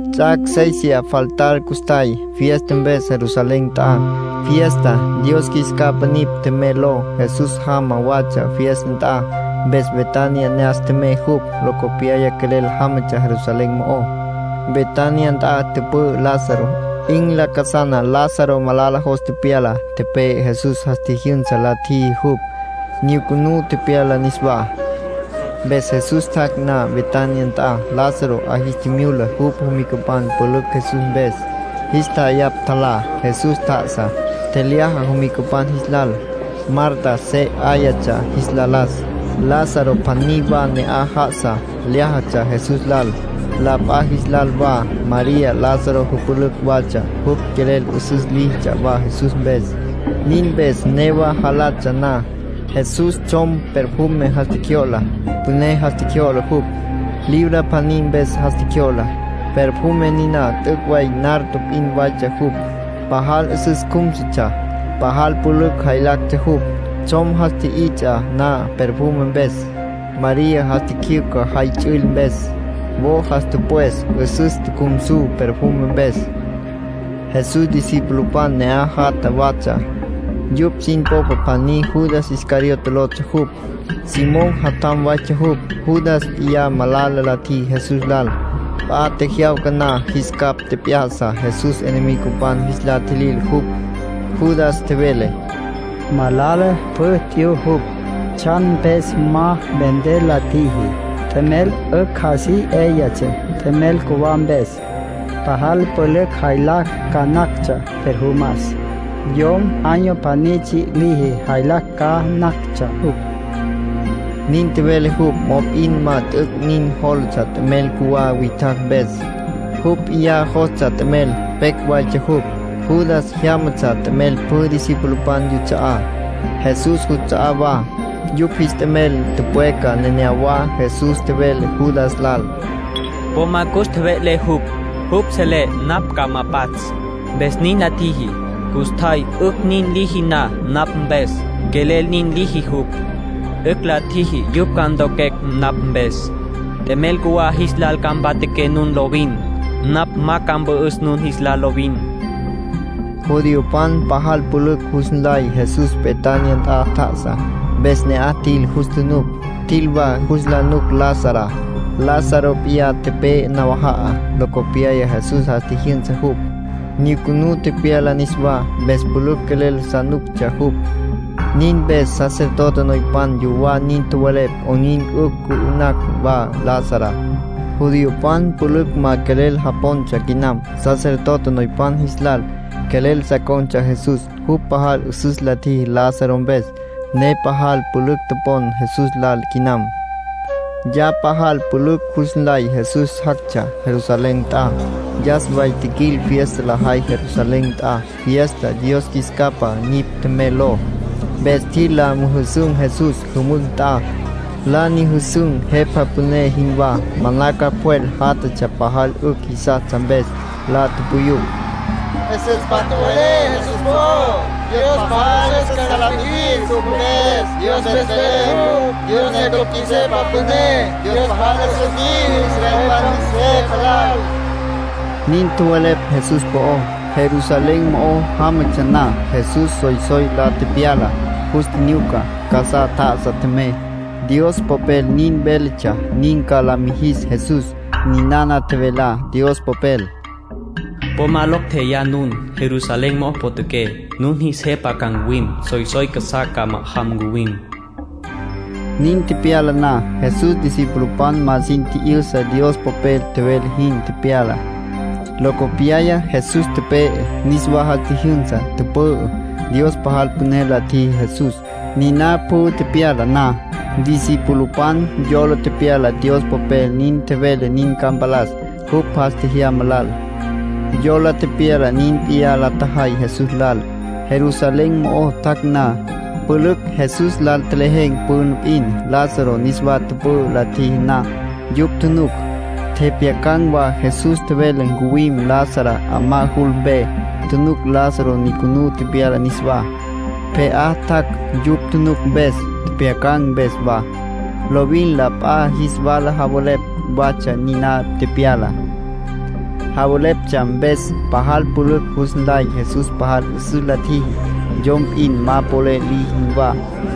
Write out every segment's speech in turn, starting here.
Ts'ac' séisiya faltar custjay, fiesta mpes Jerusalén nt'a, fiesta “Dios Qjuis Capa Nipj Tjemey” ló. Jesús jama watsja fiesta nt'a. Mpes Betania ne'as tjemey jupj, locopyaya quelel jámatsja Jerusalén mo'ó. Betania nt'a tüpü'ü Lázaro. 'In lacasana Lázaro malala jos tepyala, tepe'e. Jesús jas tjijyünsa la tjiji jupj, nyucunú tepyala niswá. Mpes Jesús tjac' na Betania nt'a, Lázaro 'a jis tjimyula jupj jomicapan pülücj Jesús mpes, jis tja'ayapj tjalá. Jesús tjá'asa, tjelyaja jomicapan jis lal. Marta se 'áyatsja jis la las. Lázaro pjaní wa ne'aj já'asa, lyájatsja Jesús lal, la p'a jis lal wa. María Lázaro jüpülücj watsja. Jupj quelel 'üsüs líjitsja wa Jesús mpes. Nin mpes newa jalatsja na, Jesús tsjom perfume jas tjecjyo'la. Püné jas tjecjyo'la jupj, libra pjaní mpes jas tjecjyo'la. Perfume niná t'üc' way nardo p'in waytsja jupj. Pajal 'üsüs cjúmsutsja, pajal pülücj jaylactsja jupj. Tsjom jas tji'its'a na perfume mpes, María jas tjicjyücja jay ts'üil mpes. Wo jas tüpwes 'üsüs tjucjumsu perfume mpes. Jesús discipulopan ne'aj jatja watsja. Yupj sin popa pjaní Judas Iscariote lotsja jupj. Simón jatjam waytsja jupj. Judas p'iyá malala la tjiji Jesús lal. P'a tjejyawca na jis capj tjep'ya'sa Jesús enemigopan jis la tjilil jupj. Judas tjevele: —Malala pjü t'yu jupj. ¿Tsjan mpes ma vender la tjiji? T'emel 'ücj así 'yáyatsja t'emel cjuwá mpes. Pajal pülücj jaylacj ca nactsja perfumas. Yom año pjaní tsji' liji jaylacj ca nactsja jupj. Nin tjevele jupj, mop'in ma t'üc' nin jólatsja t'emel cjuwá witjacj mpes. Jupj p'iyá jostsja t'emel. Pecj waytsja jupj. Judas jyámatsja t'emel pjü discipulopan yuts'a'á, Jesús juts'a'á wa. Yupj jis t'emel tüpweca neneyawá. Jesús tjevele Judas lal: —Po ma cus tjeve'le jupj. Jupj selé napj ca ma pats', mpes nin la tjiji. Custjay 'ücj nin liji na napj mpes, quelel nin liji jupj. 'Ücj la ntjiji yupj ca ntoquecj napj mpes. T'emel cjuwá jis lal ca mpatjaqué nun lovin. Napj ma ca mpü'üs nun jis lal lovin. Judiopan pajal pülücj jus nlay Jesús Betania nt'a tjá'asa, mpes ne'aj tjil jus tjunuc. Tjil wa jus la nuc Lazará. Lázaro p'iyá tepe'e nawaja'a. Locopyaya Jesús jas tjijyünsa jupj, nyucunú tepyala niswá, mpes pülücj quelel sa nuctsja jupj. Nin mpes sacerdote noypan yuwá nin tjowelepj 'onin 'ücj cü'ü'nacj wa Lazará. Judiopan pülücj ma quelel japontsja quinam sacerdote noypan jis lal. Quelel sa con̈tsja Jesús. Jupj pajal 'üsüs la tjiji Lázaro mpes, ne pajal pülücj topon Jesús lal quinam. Ya pajal pülücj jus nlay Jesús jactsja Jerusalén nt'a. Yas way tjiquil fiesta lajay Jerusalén nt'a, fiesta “Dios Qjuis Capa Nipj Tjemey” ló. Mpes tjil la müjüsün̈ Jesús jümücj nt'a. La nyüjüsün̈ jepa püné jinwá. Manaca pjwel jatatsja pajal 'ücj jisastsja mpes. La tupuyupj: —'Üsüs pjac tjowelé Jesús po'ó. Dios pajal 'üsüs ca la mijis jupj mpes. Dios mpes vele jupj, Dios ne cupj qjuis Jepa Püné. Dios pajal 'üsüs liji israelpan jis Jepa lal —nin tjowelepj Jesús po'ó. Jerusalén mo'o jámatsja na, Jesús soysoy la tepyala, jus tjinyuca. Casá tjá'asa tjemey. Dios Popel nin véletsja nin ca la mijis Jesús. Ninana tjevelá Dios Popel: “Po ma locj tjeyá nun, Jerusalén mo'o potjaqué. Nun jis jepa ca ncuwim. Soysoy casá ca ma'ajam, ncuwim.” Nin tepyala na, Jesús discipulopan ma sin tji'yüsa Dios Popel tjevele jin tepyala. Locopyaya Jesús tepe'e, niswa jas tjijyünsa, tüpü'ü. Dios pajal püné la tjiji Jesús. Niná pjü tepyala na, discipulopan yola tepyala Dios Popel nin tjevele nin ca mpalas jupj jas tjejyama lal. Yola tepyala nin p'iyá la tjajay Jesús lal, Jerusalén mo'o tjac' na. Pülücj Jesús lal tjelejen̈ püna p'in, Lázaro niswa tüpü'ü la tjiji na. Yupj tjunuc, tjepjyacan̈ wa Jesús tjevele ncuwim Lazará 'amá jul mpe. Tjunuc Lázaro nyucunú tepyala niswá, pje'á tjac'. Yupj tjunuc mpes, tjepjyacan̈ mpes wa, lovin la p'a jis wala javelepj watsja niná tepyalá. Javeleptsja mpes, pajal pülücj jus nlay Jesús pajal 'üsüs la tjiji, yom p'in ma polel liji jinwá.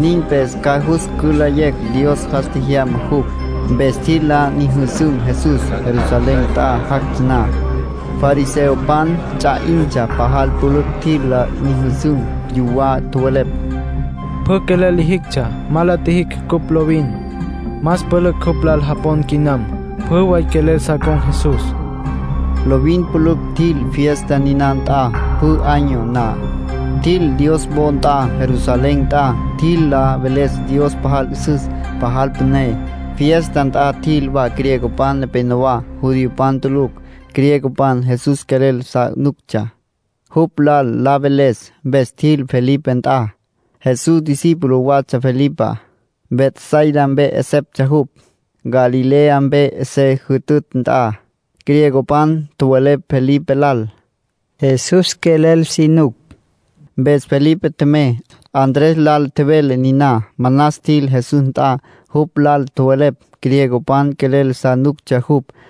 Nin mpes ca jus cülayecj Dios jas tjejyama jupj. Mpes tjil la nyüjüsün̈ Jesús, Jerusalén nt'a jactsja na. Fariseopan ts'a 'intsja pajal pülücj tjil la nyüjüsün̈. Yuwá tjowelepj: —Pjü quelel lijictsja ma la tjijicj cupj lovin. Más pülücj jupj lal japon quinam. Pjü way quelel sa con̈ Jesús. Lovin pülücj tjil fiesta niná nt'a, pjü año na. Tjil Dios wo nt'a Jerusalén nt'a. Tjil la veles Dios pajal 'üsüs, pajal püné. Fiesta nt'a tjil wa griegopan nepenowá, judiopan tulucj. Griegopan Jesús quelel sa nuctsja, jupj lal la veles. Mpes tjil Felipe nt'a. (Jesús discípulo watsja Felipá. Betsaida mpe 'eseptsja jupj, Galilea mpe se jütütj nt'a.) Griegopan tjowelepj Felipe lal: —Jesús quelel si nucucj. Mpes Felipe tjemey, Andrés lal tjevele niná. Manas tjil Jesús nt'a, jupj lal tjowelepj griegopan quelel sa nuctsja jupj.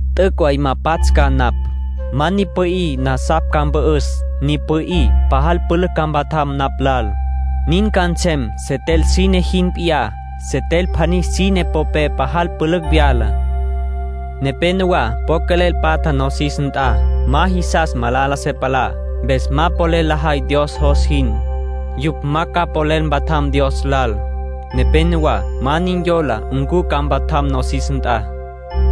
T'üc' way ma pats' ca napj. Ma ni pü'í, nasapj ca mpü'üs. Ni pü'í, pajal pülücj ca mpatjam napj lal. Nin ca nsem setel sine jin p'iyá. Setel pjaní sine popé pajal pülücj vyala. Nepénowa po quelel patja nosis nt'a. Ma jisas malala se palá, mpes ma polel lajay Dios jos jin. Yupj ma ca polel mpatjam Dios lal. Nepénowa ma nin yola ncu ca mpatjam nosis nt'a.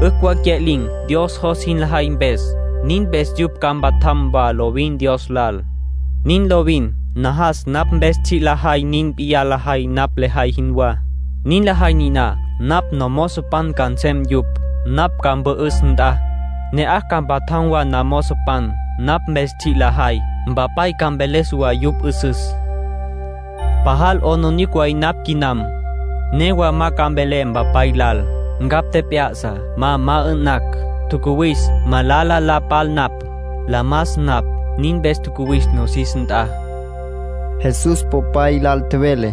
'Ücj wa cya'lin̈ Dios jos jin lajay mpes. Nin mpes yupj ca mpatjam wa lovin Dios lal. Nin lovin. Najas napj mpes tsji' lajay nin p'iyá lajay napj lejay jinwá. Nin lajay niná, napj nomozopan ca nsem yupj. Napj ca mpü'üs nt'a, ne'aj ca mpatjam wa namozopan. Napj mpes tsji' lajay, Mpapay ca mveles wa yupj 'üsüs. ”Pajal 'aplijila way napj quinam. Newa ma ca mvelé Mpapay lal: ‘Ncapj tjep'ya'sa ma ma 'ü'nacj’. Tjacuwis malala la pal napj, la mas napj. Nin mpes tjacuwis nosis nt'a. Jesús Popay lal tjevele: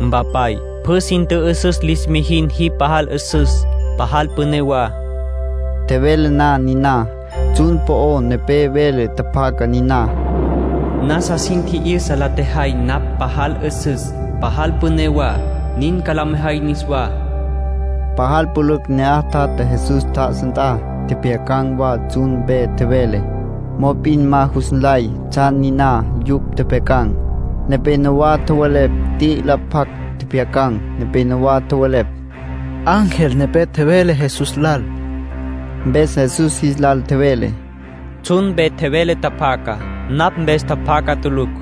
—Mpapay, pjü sin tjü'üsüs lis mijin jipj pajal 'üsüs, pajal püné wa. Tjevele na niná, tsjun po'o nepé vele tjapjaca niná: “Nasa sin tji'yüsa la tjejay napj pajal 'üsüs, pajal püné wa. Nin ca la mejay niswá.” Pajal pülücj ne'aj tjatja Jesús tjá'asa nt'a. Tjepjyacan̈ wa tsjun mpe tjevele. Mop'in ma jus nlay tsjan niná yupj tjepjyacan̈. Nepénowa tjowelepj t'i'ila pjac tjepjyacan̈. Nepénowa tjowelepj: —Ángel nepé tjevele Jesús lal. Mpes Jesús jis lal tjevele: —Tsjun mpe vele tjapjaca, napj mpes tjapjaca tulucj.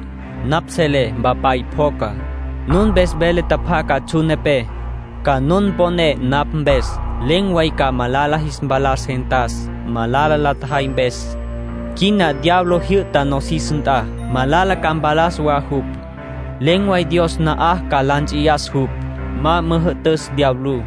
Napj selé Mpapay pjoca. Nun mpes vele tjapjaca tsjun nepé, ca nun mponé napj mpes. Len̈ way ca malala jis mpalas gentas, malala la tjajay mpes. Quina diablo jyü'ta nosis nt'a. Malala ca mpalas wa jupj. Len̈ way Dios na'aj ca la nts'iyas jupj, ma müjü'tüs diablú.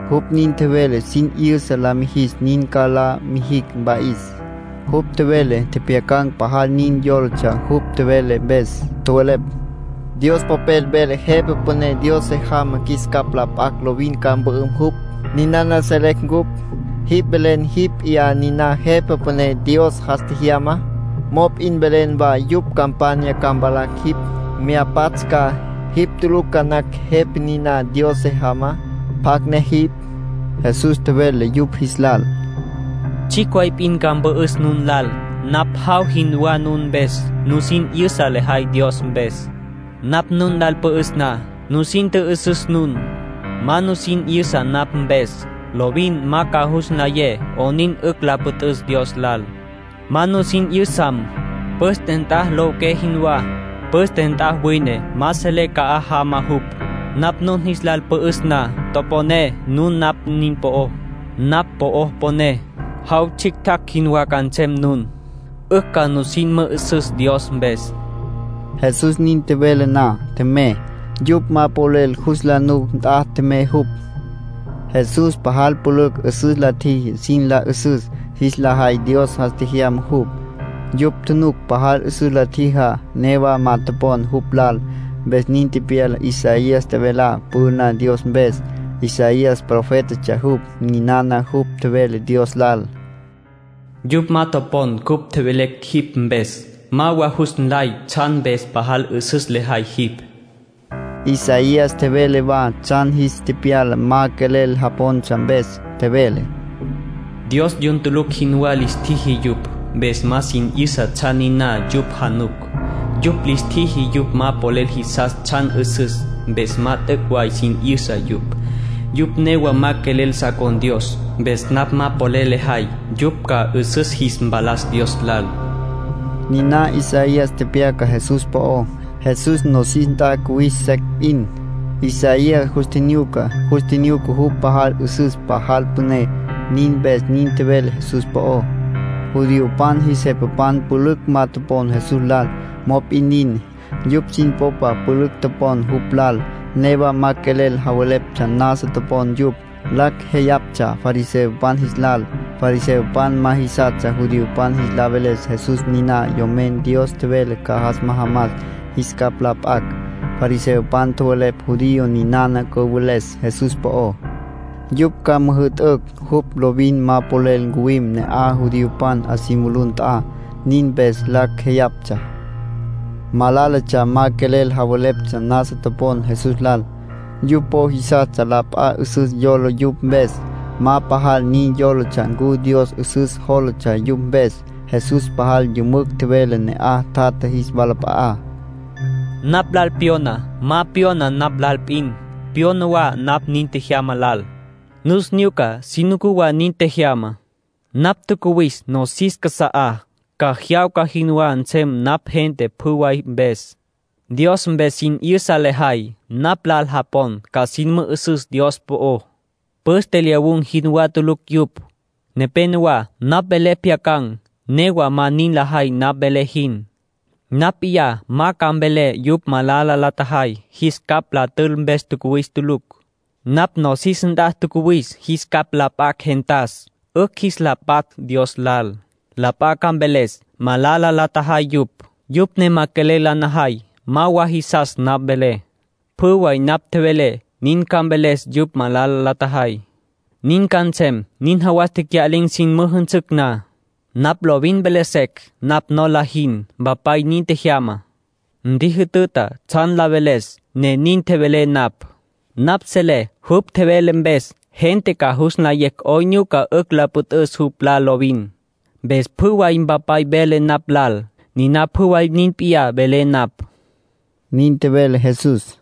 Jupj nin tjevele sin 'yüsa la mijis nin ca la mijicj mpa'is. Jupj tjevele tjepjyacan̈ pajal nin yólatsja jupj tjevele mpes. Tjowelepj: —Dios Popel vele Jepa Püné Dios se jamá qjuis capj la p'acj lovin ca mpü'üm jupj. Ninana selecj cupj. Jipj velen jipj p'iyá niná Jepa Püné Dios jas tjejyamá, mop'in velen wa yupj campanya ca mvalacj jipj, mya pats' ca. Jipj tulucj ca nacj Jepa niná Dios se jamá. ¿Pjacj ne jipj? Jesús tjevele yupj jis lal: —Tsjicj way p'in ca mpü'üs nun lal. Napj jaw jinwá nun mpes. Nusin 'yüsa lejay Dios mpes. Napj nun lal pü'üs na, nusin tjü'üsüs nun. Ma nusin 'yüsa napj mpes, lovin ma ca jus nlayé 'onin 'ücj la püt'üs Dios lal. Ma nusin 'yüsam, püste nt'a lowiqué jinwá. Püste nt'a wine, ma selé ca'aj jama jupj. Napj nun jis lal pü'üs na, toponé nun napj nin po'ó. Napj po'o poné, jaw tsjictjacj jinwá ca nsem nun. 'Ücj ca nusin mü'üsüs Dios mpes. Jesús nin tjevele na, tjemey. Yupj ma polel jus la nuc nt'a tjemey jupj. Jesús pajal pülücj 'üsüs la tjiji sin la 'üsüs jis la jay Dios jas tjejyama jupj. Yupj tjunuc pajal 'üsüs la tjijá. Newa ma topon jupj lal. Mpes nin tepyala Isaías tjevelá püná Dios mpes. Isaías profétatsja jupj. Ninana jupj tjevele Dios lal: “Yupj ma topon cupj tjevelecj jipj mpes. Ma wa jus nlay tsjan mpes pajal 'üsüs lejay jipj.” Isaías tjevele wa tsjan jis tepyala ma quelel japontsja mpes. Tjevele: “Dios yun tulucj jinwá lis tjiji yupj, mpes ma sin 'yüsa tsjan niná yupj januc. Jupj lis tjiji yupj ma polel jisas tsjan 'üsüs, mpes ma t'üc' way sin 'yüsa yupj. Yupj newa ma quelel sa con̈ Dios, mpes napj ma polel lejay yupj ca 'üsüs jis mpalas Dios lal.” Niná Isaías tepyaca Jesús po'ó. Jesús nosis nt'a cuwis secj p'in, Isaías jus tjinyuca. Jus tjinyuca jupj pajal 'üsüs, pajal püné. Nin mpes nin tjevele Jesús po'ó. Judiopan jis jepapan pülücj ma topon Jesús lal, mop'in nin, yupj sin popa pülücj topon jupj lal. Newa ma quelel javeleptsja nasa topon yupj. Lacj jeyaptsja fariseopan jis lal. Fariseopan ma jisastsja judiopan jis la veles Jesús niná Yomen Dios tjevele ca jas majamas jis capj la p'acj. Fariseopan tjowelepj judío ninana cüveles Jesús po'ó, yupj ca müjü'tücj jupj lovin ma polel ncuwim ne'aj judiopan 'a si mulú nt'a. Nin mpes lacj jeyaptsja. Malálatsja ma quelel javeleptsja nasa topon Jesús lal. Yupj po jisastsja la p'a 'üsüs yola yupj mpes. Ma pajal nin yólatsja ncu Dios 'üsüs jólatsja yupj mpes. Jesús pajal yümücj tjevele ne'aj tjatja jis walap'a'á: —Napj lal pyona, ma pyona napj lal p'in. Pyona wa napj nin tjejyama lal. Nus nyuca, si nucú wa nin tjejyamá. Napj tjacuwis nosis casa'á, ca jyawca jinwá nsem napj gente pjü way mpes. Dios mpes sin 'yüsa lejay. Napj lal japon, ca sin mü'üsüs Dios po'ó. Püste lyawun̈ jinwá tulucj yupj. ”Nepénowa napj velé pjyacan̈, newa ma nin lajay napj velé jin. Napj p'iyá ma ca mvelé yupj malala la tjajay. Jis capj la tül mpes tjacuwis tulucj. Napj nosis nt'a tjacuwis jis capj la p'acj gentas, 'ücj jis la patj Dios lal. La p'a ca mveles malala la tjajay yupj, yupj ne ma quelel la najay, ma wa jisas napj velé. Pjü way napj tjevelé nin ca mveles yupj malala la tjajay. Nin ca nsem nin jawas tecya'lin̈ sin müjünsücj na. Napj lovin vele secj napj nola jin. Mpapay nin tjejyama, ntjijütüta tsjan la veles, ne nin tjevelé napj. Napj selé jupj tjevele mpes gente ca jus nlayecj 'onin nyuca 'ücj lo püt'üs jupj lal lovin. Mpes pjü way Mpapay vele napj lal, niná pjü way nin p'iyá velé napj —nin tjevele Jesús.